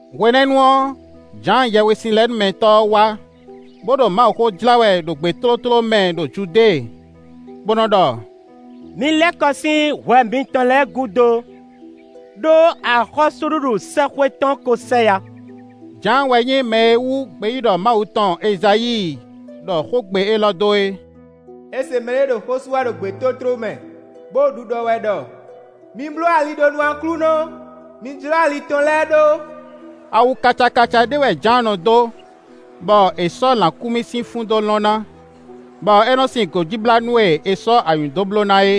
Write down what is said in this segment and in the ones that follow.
Hwenɛ́nu ɔ́, Jǎan Yɛhwesinlɛnúmɛtɔ́ ɔ́ wá, bó ɖo Mawuxó jlá wɛ ɖo gbětótló mɛ ɖo Judée, bó nɔ́ ɖɔ: “Mi lɛ́ kɔ sín hwɛ mitɔn lɛ́ɛ gúdo, ɖó axɔ́súɖuɖu sɛ́xwé tɔn kó sɛ yá.” Jǎan wɛ nyí mɛ e wú gbeyíɖɔ Mawu tɔn Ezayíi ɖɔ xógbe élɔ́ dó é: “È se mɛɖé ɖo xó sú wɛ ɖo gbětótló mɛ, bó ɖo ɖiɖɔ wɛ ɖɔ: ‘Mi bló ali ɖó nú Aklúnɔ, mi jlɔ́ ali tɔn lɛ́ɛ ɖó.’” Awu kacakaca ɖé wɛ Jǎan nɔ dó, bɔ è sɔ́ lǎkúnmí sín fún dó lɔn ná, bɔ é nɔ́ sin gǒjíblánú e è sɔ́ anyǔ dó bló ná é.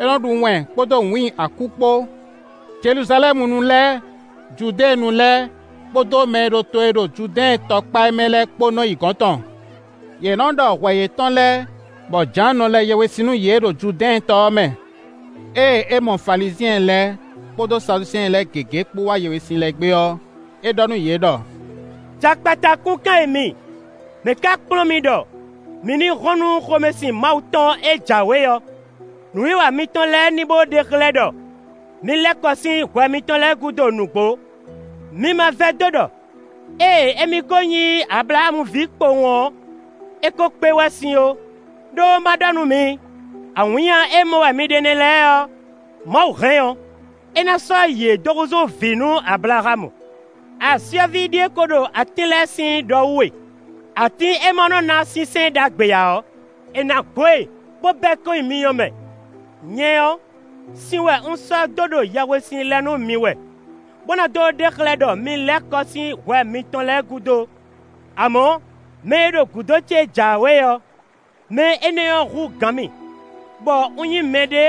É nɔ ɖu wɛn kpódó wǐin akú kpó. Jeluzalɛ́munu lɛ́ɛ, Judéenu lɛ́ɛ kpódó mɛ e ɖo to e ɖo Judɛ́ɛn tɔ kpá é mɛ lɛ́ɛ kpó nɔ́ yi gɔ̌n tɔn. Yě nɔ́ ɖɔ hwɛ yětɔn lɛ́ɛ, bɔ Jǎan nɔ lɛ yɛhwesin nú yě ɖo Judɛ́ɛn tɔ ɔ́ mɛ. Ée é mɔ Falizyɛn lɛ́ɛ kpódó Saduseɛn lɛ́ɛ gěgé kpó wá yɛhwesin lɛ gbé ɔ́, é ɖɔ nú yě ɖɔ: “Jakpata kúnkan e mi! Mɛ̌ ka kplɔ́n mi ɖɔ mi ní hɔn nú xomɛsin Mawu tɔn e jǎwe ɔ́?” Nǔwiwa mitɔn lɛ́ɛ ní bó ɖe xlɛ́ ɖɔ mi lɛ́ kɔ sín hwɛ mitɔn lɛ́ɛ gúdo nǔgbó. Mi ma vɛdó ɖɔ ée émí ko nyí Ablaxámu ví kpowun ɔ́, é ko kpé wɛ sín ó. Ɖó, ma ɖɔ nú mi, awǐnnya e mɔ wɛ mi ɖe nɛ́ lɛ́ɛ ɔ́, Mawu hɛn ɔ́, é ná sɔ́ yě dó húzú vǐ nú Ablaxámu. Asyɔ́ví ɖíe ko ɖo atín lɛ́ɛ sín ɖɔ wú e: atín e ma nɔ ná sínsɛ́n ɖagbe ǎ ɔ́, è nǎ gbo e, bó bɛ́ kɔn nyi myɔ mɛ. Nyɛ ɔ́, sin wɛ un sɔ́ dó ɖo yɛhwesin lɛ nú mi wɛ, bó ná dó ɖe xlɛ́ ɖɔ mi lɛ́ kɔ sín hwɛ mitɔn lɛ́ɛ gúdo; amɔ̌, mɛ e ɖo gǔdo ce jǎwe ɔ́, mɛ énɛ́ ɔ́ hú gǎn mì, bɔ un nyí mɛɖé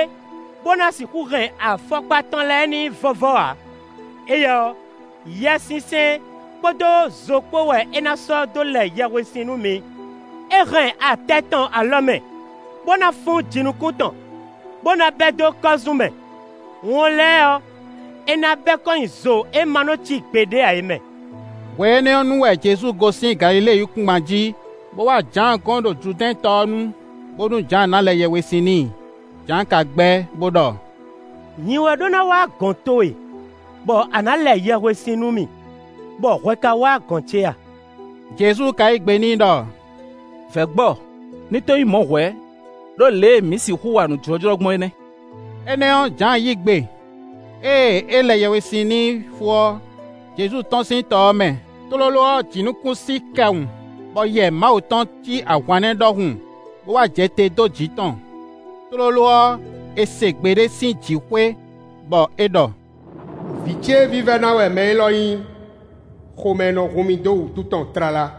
bó ná sixú hɛn afɔkpa tɔn lɛ́ɛ n'i vɔ́vɔ́ ǎ; éyɛ́ ɔ́, Yɛsinsɛn kpódó zo kpó wɛ é ná sɔ́ dó lɛ yɛhwesin nú mi. É hɛn atɛ tɔn alɔ mɛ, bó ná fún jinukún tɔn, bó ná bɛ́ dó kɔ́zún mɛ; wɔn lɛ́ɛ ɔ́, é ná bɛ́ kɔn nyi zo e ma nɔ cí gbeɖé ǎ é mɛ. Hwe énɛ́ ɔ́ nu wɛ Jezu gosín Galilée yíkúngban jí, bó wá Jǎan gɔ́n ɖo Judɛ́ɛn tɔ ɔ́ nu, bónú Jǎan ná lɛ yɛhwesin n'i. Jǎan ka gbɛ́, bó ɖɔ: “Nyi wɛ ɖó ná wá gɔ̌n towe, bɔ a nǎ lɛ yɛhwesin nú mì, bɔ hwɛ ka wá gɔ̌n ce a?” Jezu ka yí gbe n'i ɖɔ: “Vɛ̌ gbɔ, ní to nyí mɔ̌ hwɛ̌; ɖó lě e mǐ sixú wa nǔ jlɔ́jlɔ́ gbɔn é nɛ́.” Énɛ́ ɔ́, Jǎan yí gbe. Ée é lɛ yɛhwesin n'i fó ɔ́, Jezu tɔ́n sín tɔ ɔ́ mɛ; tlóló ɔ́, jǐnukúnsin kɛ wun, bɔ Yɛ Mawu tɔn cí ahwannɛ́ ɖɔhun, bó wá jɛ te dó jǐ tɔn. Tlóló ɔ́, è se gbe ɖé sín jǐxwé bɔ é ɖɔ: “Vǐ ce vívɛ́ná wɛ mɛ élɔ́ nyí; xomɛ nɔ hun mì dó wǔtu tɔn tlala.”